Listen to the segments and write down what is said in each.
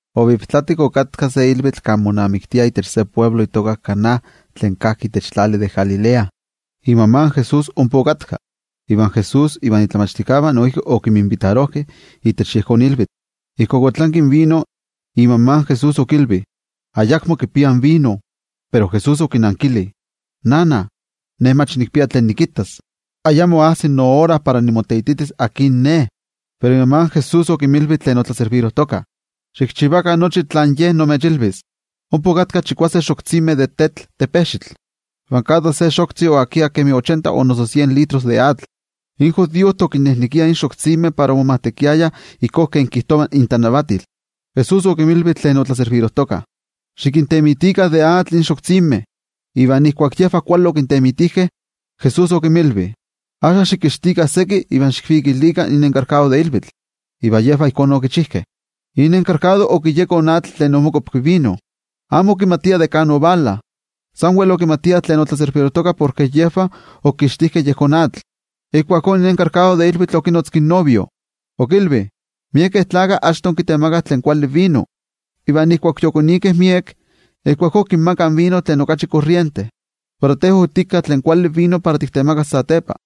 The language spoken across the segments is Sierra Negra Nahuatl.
Oviptlatik okatka se ilvitl kan monamiktiah itech se altepetl itoka Caná tlen kajki itech tlali de Galilea. Imama in Jesús ompa okatka, iva Jesús ivan momachtijkeh noijki okinminvitarojkeh itech yejón ilvitl. Ijkuak otlanki in vino, imama Jesús okilvi: —Ayakmo kipiah vino. Pero Jesús okinankili: —Nana, ne mach nikpia tlen nikittas. Ayamo ajsi noora para nimoteititis akin ne. Pero imama in Jesús okinmilvi tlen otlaservirojtokah: —Xikchivakah nochi tlen Ye imechilvis. Ompa okatkah chikuase xoktzimeh de tetl, ivan kada se xoktzi oakia kemi ochenta o noso sien litros de atl. In judiojtih okinnejnekiah in xoktzimeh para omomajtekiayah ijkó kemi kijtova intlanavatil. Jesús okinmilvi tlen otlaservirojtokah: —Xikintemitikah de atl in xoktzimeh. Iva ijkuak yejvah kuali okintemitijkeh, Jesús okinmilvi: —Axka xikixtikah seki iva xikvikilikah in tetajchi de ilvitl. Iva yejvah ijkó okichijkeh. In tetajchi okiyeko in atl tlen omokuapki vino, amo okimatia de kan ovala, okimatiah san yejvah tlen otlaservirojtokah porke yejvah okixtitoh yejón atl. Ijkuakó in tetajchi de ilvitl okinotzki in novio. Okilvi: —Miekeh achto kitemakah tlen kuali vino, iva ijkuak yokonikeh miek, ijkuakó kinmakah in vino tlen okachi korriente. Pero te otika tlen kuali vino para tiktemakas satepa.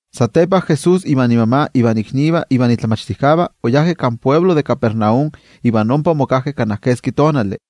Satepa, Jesús ivan imama, ivan iknivah ivan momachtijkeh oyajkeh kan altepetl de Capernaum iva ompa omokajkeh kana keski tonali.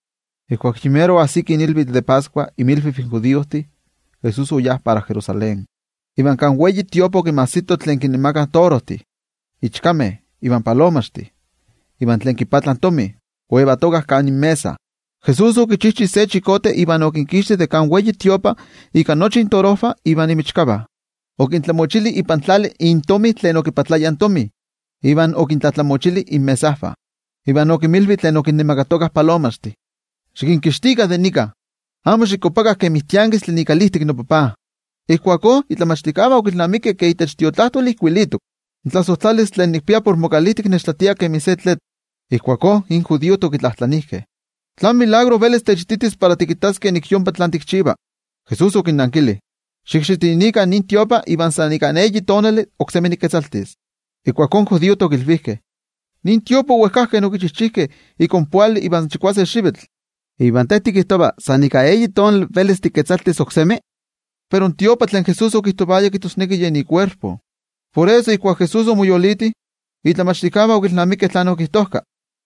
Ijkuak yi mero ajsiki ilvitl de Pascua, inmilviv in judiojtih, Jesús oyá para Jerusalén. Iva kan ikiavak in templo okinmajsito in torojnemakakeh, in ichkanemakakeh ivan palomaxnemakakeh, iva tlen okipatlayah tomi oyetokah kan inmesa. Jesús okichi se kuarta iva okinkixti de kan templo ika nochi intorojvah iva inmichkavah. Okintlamochili ipan tlali intomi tlen okipatlayah tomi iva okintlatlamochili inmesajvah. Iva okinmilvi tlen okinnemakatokah palomaxtih: —¡Xikinkixtikah de nika! ¡Amo xikuapakah kemi tiankistli ikalijtik in noTajtzi! Ijkuakó, in momachtijkeh okilnamikeh ke itech Tiotlajkuiloli ijkuilitok: “In tlasojtlalistli tlen nikpia por mokalijtik nechtlatia kemi se tlitl.” Ijkuakó in judiojtih okitlajtlanijkeh: —¿Tlán tetzavkaneskayotl velis techititis para tikittaskeh nik yompa tlen tikchiva? Jesús okinnankili: —Xikxitinikah nin templo iva san ika eyi tonali oksemi niketzaltis. Ijkuakó in judiojtih okilvijkeh: —Nin templo owejkajkeh okichijkeh ika ompoali ivan chikuase xivitl. ¿Iva te tikijtova san ika eyi tonali velis tiketzaltis oksemi? Pero in templo tlen Jesús okijtovaya, kijtosneki yen ikuerpo. Por eso, ijkuak Jesús omoyoliti, in momachtijkeh okilnamikeh tlen okijtojka,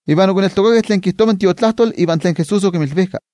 iva okineltokakeh tlen kijtova in Tiotlajkuiloli iva tlen Jesús okimilvijka.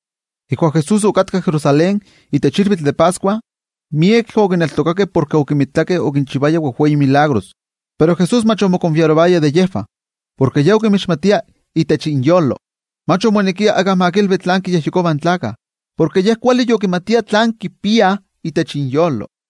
Ijkuak Jesús okatka Jerusalén itech ilvitl de Pascua, miekeh okineltokakeh porke okimitakeh okinchivaya wejwei tetzavkaneskayomeh. Pero Jesús mach omokonfiarovaya de yejvah, porke Ye okinmixmatia itech inyolo. Mach omonekia íkka ma kilvi tlán kiyejyekovah in tlaltikpaktlakah, porke Ye kuali yokimatia tlán kipiah itech inyolo.